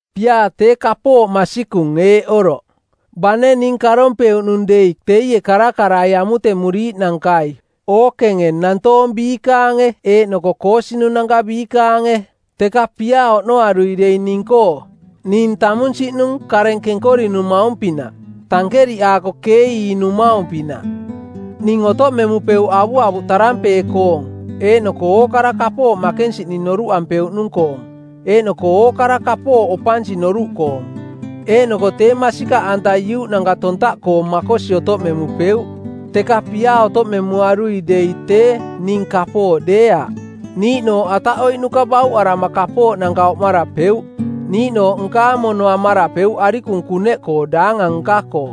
Piaa tee kapooꞌ masikung eeꞌ oroꞌ: Bane ning karompeuꞌnung dei teie karakarai amutemuriiꞌnankai ookenge nantoong biikaange eeꞌnoko koosinunanka biikaange, teka piaa oꞌnoarui dei ning-koo, ning tamunsiꞌnung kareng kenkorinumaung-pinaꞌ, tankeriꞌ aako keeiinumaung-pinaꞌ. Ning otoꞌmemupeuꞌ avuavuꞌ tarampee˜ koong eeꞌnoko ookara kapooꞌ makensiꞌning noruꞌampeuꞌnung-koong eeꞌnoko ookara kapooꞌ opansi noruꞌkoong, eeꞌnoko tee masikaꞌanta iuꞌnanka tontaꞌkoong makosi otoꞌmemupeuꞌ, teka piaa otoꞌmemuarui dei tee ning kapooꞌ deeaꞌ. Niiꞌnooꞌ ataꞌoiꞌnuka bauꞌarama kapooꞌnanka oꞌmarapeuꞌ, niiꞌnooꞌ nkaang mono amarapeuꞌ arikung kuneꞌkoo daangang nka-koo,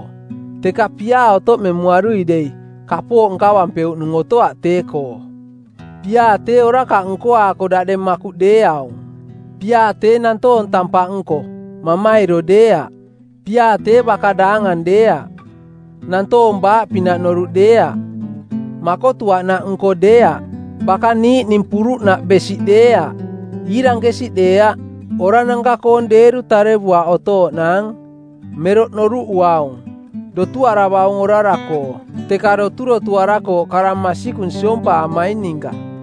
teka piaa otoꞌmemuarui dei, kapooꞌ nkavampeuꞌnung otoaꞌ tee-koo. Piaa tee orakaꞌ nkoaako daꞌdeng makuꞌ deeaung; Piaa tee nantoong tampaꞌnko, mamairo deeaꞌ; Piaa tee baka daangang deeaꞌ, nantoong baaꞌpinaꞌ noruꞌ deeaꞌ, makotuaꞌnaꞌnko deeaꞌ, baka niiꞌning puruꞌnaꞌ besiꞌ deeaꞌ, iirankesiꞌ deeaꞌ, orananka-koong deeru tarevuaꞌ otooꞌnaang, meroꞌ noruꞌuaung, dotuaravaung orara-koo, teka doturotuarakooꞌ kara masikung siompaamaing ninka.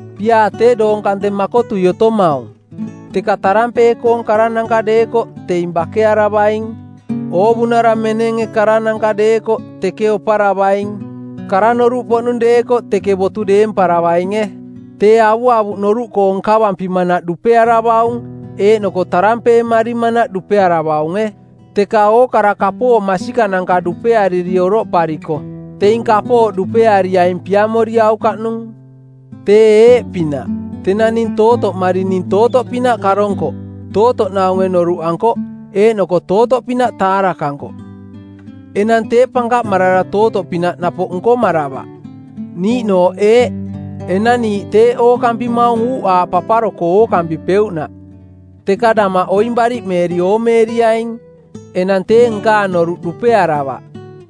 Piaa tee doong kante makotui otomaung, teka tarampee-koong karananka deekoꞌ teing bakearavaing. Oovunara menenge karananka deekoꞌ teke oparavaing. Kara noruꞌpoꞌnung deekoꞌ teke botu deemparavainge. Tee avuavuꞌ noruꞌkoong nkavampimanaꞌ dupearavaung, eeꞌnoko tarampeemarimanaꞌ dupearavaunge. Teka ookara kapooꞌ masikananka dupeariri oroꞌpariko, teing kapooꞌ dupeariaing piamoriaukaꞌnung. Tee eeꞌpinaꞌ: Tenang ning tootoꞌmari ning tootoꞌpinaꞌ karonkoꞌ, tootoꞌnaunge noruꞌankoꞌ, eeꞌnoko tootoꞌpinaꞌ taarakankoꞌ. Enang tee pankaꞌmarara tootoꞌpinaꞌ napoꞌ nkomaravaꞌ. Niiꞌnooꞌ eeꞌ: Enang niiꞌ teeꞌ ookampimaung uuꞌaaꞌ paparo-koo ookampipeuꞌnaꞌ, teka damaꞌ oing bariꞌmeeri oomeeriaing. Enang tee nkaang noruꞌ dupearavaꞌ,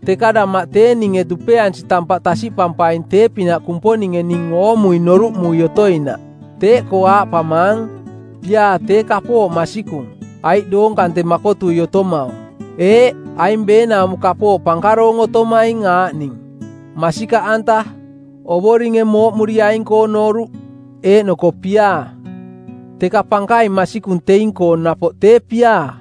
teka damaꞌ tee ninge dupeansi tampaꞌ tasiꞌpampaing tee-pinaꞌ Kumponinge ning oꞌmui noruꞌmui otoinaꞌ. Teeꞌkoo aaꞌpamaang: Piaa tee kapooꞌ masikung, aiꞌ doong kante makotui otomaung. Eeꞌ, aing beenaumo kapooꞌ pankaroong otomatoaing aaꞌning: masikaꞌanta, Ovoringe mooꞌmuriaing-koo noruꞌ, eeꞌnoko piaa. Teka pankaing masikung teing-koo napoꞌ tee piaa.